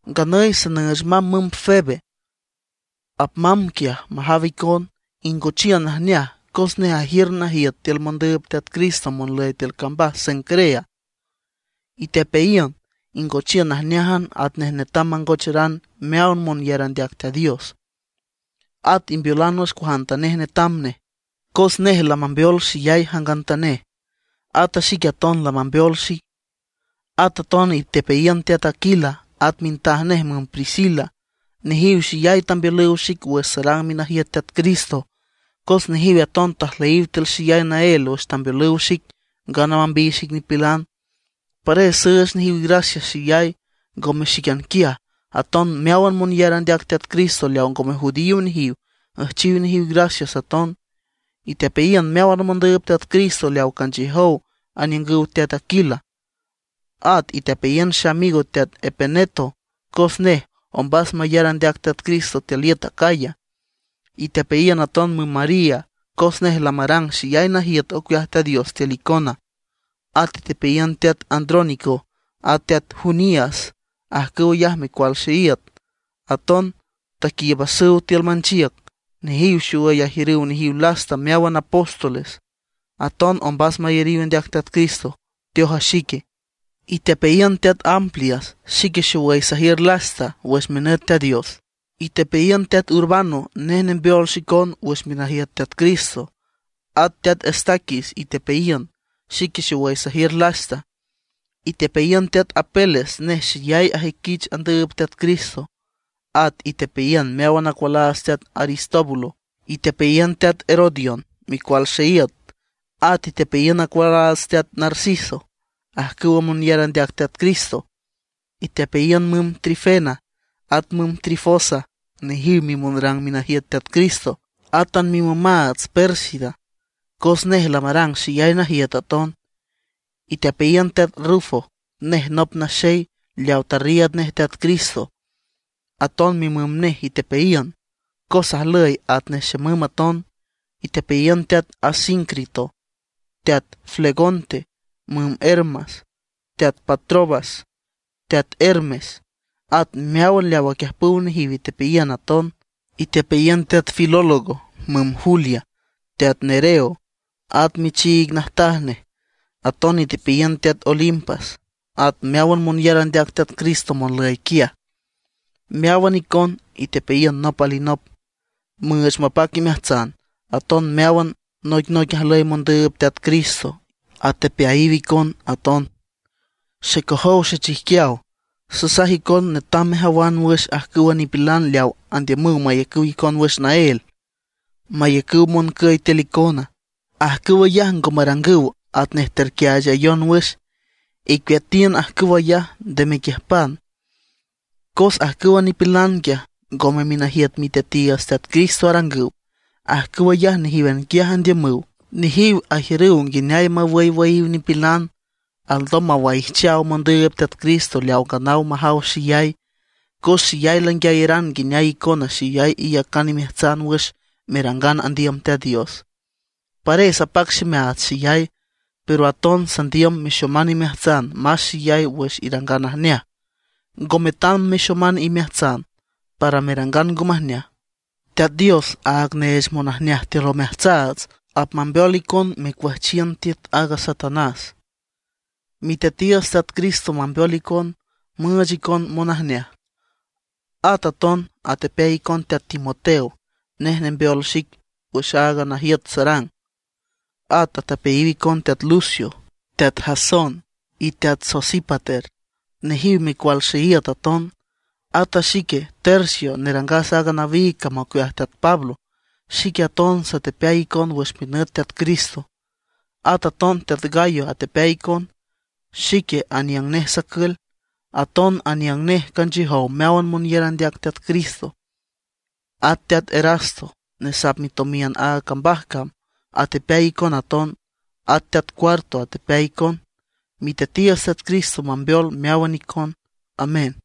Nganüy sanüüch mamb müm Febe, apmamb quiaj majaw icon, ingochiün najneaj. Cos nej ajiür najiüt tiül mondüüb Teat Cristo monlüy tiül cambaj Cencrea. Itepeayiün, ingochiün najneájan atnej netam mangocheran meáwan monyar andeac Teat Dios. At imbeolan wüx cuajantanej netam nej, cos nej lamambeol xeyay jangantanej; ata xique aton lamambeol xic. At aton itepeayiün teat Aquila at mintaj nej müm Priscila. Nejiw xeyay tambeolüw xic wüx sarang minajiüt Teat Cristo. Cos nejiw aton tajlüyiw tiül xeyay naél wüx tambeolüw xic ngana mambiy xic nipilan. Pares süüch nejiw gracias xeyay, ngome xíquian quiaj, aton meáwan monyar andeac Teat Cristo leaw ngome judío nejiw, üjchiw nejiw gracias aton. Itepeayiün meáwan mondüüb Teat Cristo leaw canchiüjow aniüngüw teat Aquila. At itepeayiün xeamigo teat Epeneto, cos nej ombas mayar andeac Teat Cristo tiül iüt Acaya. Itepeayiün aton müm María, cos nej lamarang xeyay najiüt ocueaj Teat Dios tiül icona. At itepeayiün teat Andrónico at teat Junias, ajcüw ayaj micual xeíüt, aton taquiiübasüw tiül manchiüc. Nejiw xowüy ajiür nejiw lasta meáwan apóstoles, aton ombas mayariw andeac Teat Cristo, teoj a xique. Itepeayiün teat Amplias, xique xowüy sajiür lasta wüx minüt Teat Dios. Itepeayiün teat Urbano, nej nembeol xicon wüx minajiüt Teat Cristo. At a teat Estaquis itepeayiün. Xique xowüy sajiür lasta. Itepeayiün teat Apeles, nej xeyay ajüiquich andüüb Teat Cristo. At itepeayiün meáwan acualaats teat Aristóbulo. Itepeayiün teat Herodión, micual xeíüt. At itepeayiün acualaats teat Narciso, ajcüw monyar andeac Teat Cristo. Itepeayiün müm Trifena, at müm Trifosa, nejiw mimonrang minajiüt Teat Cristo; átan mimümaats Pérsida, cos nej lamarang xeyay najiüt aton. Itepeayiün teat Rufo, nej nop naxey leaw tarriiüd nej Teat Cristo. Aton mimüm nej itepeayiün, cos ajlüy atnej xemüm aton. Itepeayiün teat Asíncrito, teat Flegonte, müm Hermas, teat Patrobas, teat Hermes, at meáwan leaw aquiüjpüw nejiw itepeayiün aton. Itepeayiün teat Filólogo, müm Julia, teat Nereo, at michiig najtaj nej. Aton itepeayiün teat Olimpas at meáwan monyar andeac Teat Cristo monlüy quiaj. Meáwan icon itepeayiün nop alinop, müüch mapac imeajtsan. Aton meáwan noicnoic ajlüy mondüüb Teat Cristo atepeayiw icon aton. Xecojow xechijquiaw, sasaj icon netam mejawan wüx ajcüwa nipilan leaw andiümüw mayacüw icon wüx naél, mayacüw moncüy tiül icona. Ajcüw ayaj ngo marangüw atnej terquiaachayon wüx. Icueatiün ajcüw ayaj, nde mequiüjpan. Cos ajcüwa nipilan quiaj ngome minajiüt Miteatiiüts Teat Cristo arangüw; ajcüw ayaj nejíwan quiaj andiümüw. Nejiw ajiürüw nguineay mawüywüyiw nipilan; alndom mawaijchaw mondüüb Teat Cristo leaw nganaw majaw xeyay. Cos xeyay languiayaran nguineay icona xeyay iyacan imeajtsan wüx merangan andiüm Teat Dios, pares apac ximeaats xeyay. Pero aton sandiüm mexoman imeajtsan más xeyay wüx irangan najneaj; ngo metam mexoman imeajtsan para merangan ngo majneaj. Teat Dios aaga neech monajneaj tiül omeajtsaats, apmambeol icon mecuüjchiün tiüt aaga Satanás. Miteatiiüts Teat Cristo mambeol icon, müüch icon monojneaj. At aton atepeay icon teat Timoteo, nej nembeol xic wüx aaga najiüt sarang. At atepeayiw icon teat Lucio, teat Jasón, y teat Sosípater. Nejiw micual xeíüt aton. At a xique Tercio nerangas aaga nawiig cam ocueaj teat Pablo, xique aton satepeay icon wüx minüt Teat Cristo. At aton teat Gayo atepeay icon, xique aniüng nej sacül. Aton aniüng nej canchiüjow meáwan monyar andeac Teat Cristo. At teat Erasto, nesap mitomiün aaga cambaj cam, atepeay icon aton; at teat Cuarto atepeay icon. Miteatiiüts Teat Cristo mambeol meáwan icon. Amén.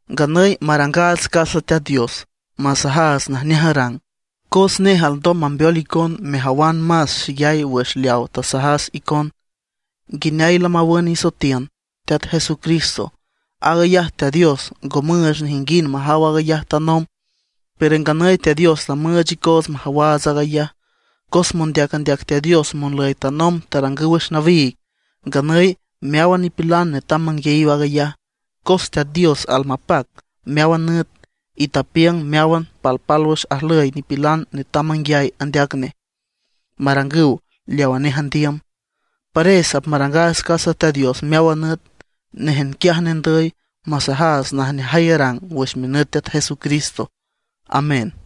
Nganüy marangaats casa Teat Dios, masajaats najneaj arang, cos nej alndom mambeol icon mejawan más xeyay wüx leaw tasajas icon, nguineay lamawün isoetiün Teat Jesucristo. Aag ayaj Teat Dios ngo müüch nejinguind majaw aaga ayaj tanomb. Pero nganüy Teat Dios lamüüch icoots majawaats aag ayaj, cos mondeac andeac Teat Dios monlüy tanomb tarangüw wüx nawiig. Nganüy meáwan nipilan netam manguiayiw aag ayaj, cos Teat Dios almapac meáwan nüt, y tapiüng meáwan palpálwüx ajlüy nipilan netam manguiay andeac nej, marangüw leawa nej andiüm. Pares apmarangaats casa Teat Dios meáwan nüt, néjan quiaj nendüy; masajaats najneajay arang wüx minüt Teat Jesucristo. Amén.